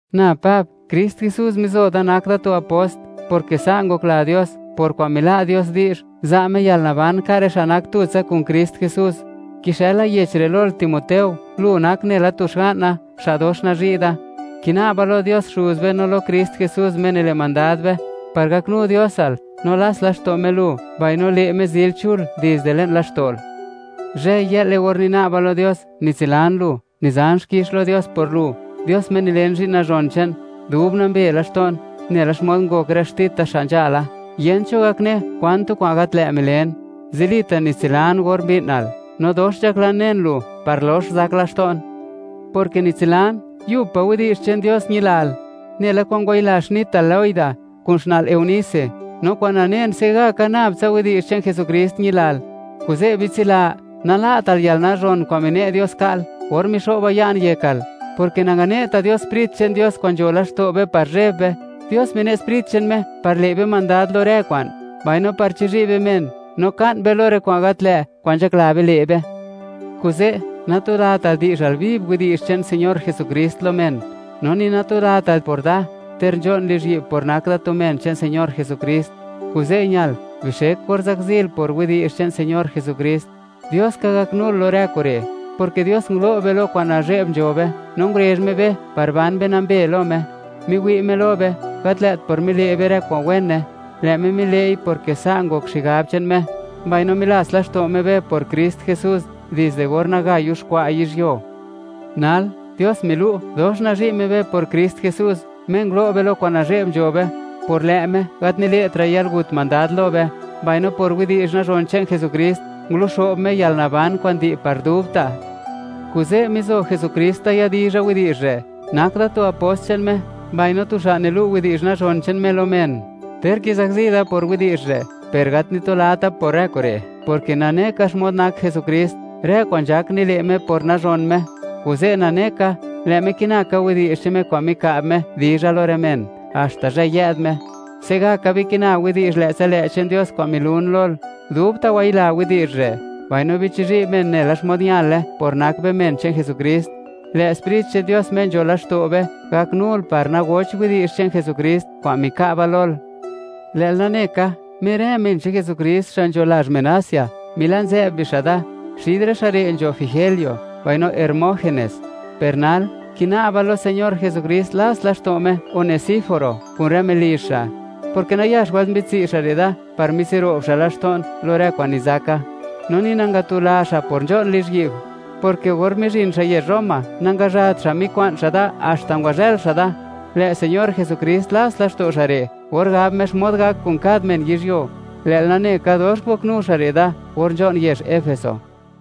Na Pab, Krist Jesús mizo da nak da tu apost; porke sa' ngokla Dios, por kwa'n mila' Dios di'zh, za' Me yalnaban ka' rë xa' nak tutsa kun Krist Jesús. Kixëla yech re' lol, Timoteo, lu nak nela tu xga'na, xa' dox nazhi' da. Kina'ba lo Dios Xuz be no lo Krist Jesús, Me nile' mandad be, par gaknu Diosal, no lats laxto' Me lu, mbaino le' Me zil chul dizde le'n laxto'l. Zhëy-yë'le, or nina'ba lo Dios, nitsilan lu, nizan xkix lo Dios por lu, Dios Me nilen zhi'n nazhon che'n, dub nambe laxto'n; nela xmod ngok rë xtita xa' nzhala, yent cho gak ne kwan tu kwa'n gat lë' milen. Zilita' nitsilan or mbi'nal, no dox nzhaklan nen lu, par lox zak laxto'n, porke nitsilan yubpa' widi'zh che'n Dios ñilal, nela kwa'n ngwayila xnital Loida, kun xna'l Eunice, no kwa'n nanen, se'gaka nab tsa widi'zh che'n Jesukrist ñilal. Kuze' bitsila, nala'tal yal yalnazhon kwa'n mine' Dios ka'l, or mixo'ba ya'n yekal, porke nangane'ta' Dios Sprit che'n Dios kwa'n nzho laxto' be par zheb be; Dios mine' Sprit che'n Me par le' be mandad lo rë kwa'n, mbaino par chizhi' be men, no ka'n be lo rë kwa'n gat lë' kwa'n nzhakla be le' be. Kuze', natulatal, di'zhal viv widi'zh che'n Señor Jesukrist lo men; no ni natulatal por da, ter nzho'n lizhyi'b por nak da tu men che'n Señor Jesukrist; kuze' ñal, bixek or zakzil por widi'zh che'n Señor Jesukrist. Dios ka gaknul lo rë kure', porke Dios ngulo' be lo kwa'n nazhe'b nzho be, no ngurezh Me be par ban be nambe lo Me. Miwi' Me lo be, gat lë't por mile' be rë kwa'n wene; lë' Me mile'i porke sa' ngok xigab che'n Me, mbaino milats laxto' Me be por Krist Jesús, dizde or naga yuxkwa' yizhyuo. Nal, Dios milu', dox nazhi' Me be por Krist Jesús, Me ngulo' be lo kwa'n nazhe'b nzho be. Por lë' Me, gat nile'tra' yalgut mandad lo be, mbaino por widi'zh nazhon che'n Jesukrist, nguluxo'b Me yalnaban kwa'n di' par dubta'. Kuze', mizo Jesukrist da yadizha widi'zh re', nak da tu apost che'n Me, mbaino tu xa' nilu' widi'zh nazhon che'n Me lo men. Ter kizakzi da por widi'zh re', per gat nitulata por rë kure', porke nane ka xmod nak Jesukrist; rë kwa'n nzhak nile' Me por nazhon Me; kuze' nane ka, lë' Me kina ka widi'zh che'n Me kwa'n mika'b Me dizha lo rë men, haxta zhë yë'd Me. Se'gaka bikina widi'zh lë'tsa lë' che'n Dios kwa'n milun lol; dubta' wayila widi'zh re', mbaino bichizhi' men nela xmod ñale por nak be men che'n Jesukrist. Lë' Sprit che'n Dios Me nzho laxto' be, gaknul par nagocht widi'zh che'n Jesukrist kwa'n mika'ba lol. Lë'l nane ka, mer rë men che'n Jesukrist xa' nzho lazh men Asia, mila'nzë'b bixa' da; xid rë xa' re' nzho Figelo mbaino Hermógenes. Per nal, kina'ba lo Señor Jesukrist, lats laxto' Me Onesíforo kun rë melizh xa', porke nayax wëlt mbi'dtsi' xa' re' da par mitsiro'b xa' laxto'n lo rë kwa'n nizaka, no ni nangatula xa' por nzho'n lizhyi'b, porke or mizhin xa' yezh Roma, nangazhat xa' mikwa'n xa' da haxta ngwazhël xa' da, Lë' Señor Jesukrist lats laxto' xa' re' or gab Me xmod gak kun kad men yizhyuo; lë'l nane ka dox ngoknu xa' re' da or nzho'n yezh Efeso.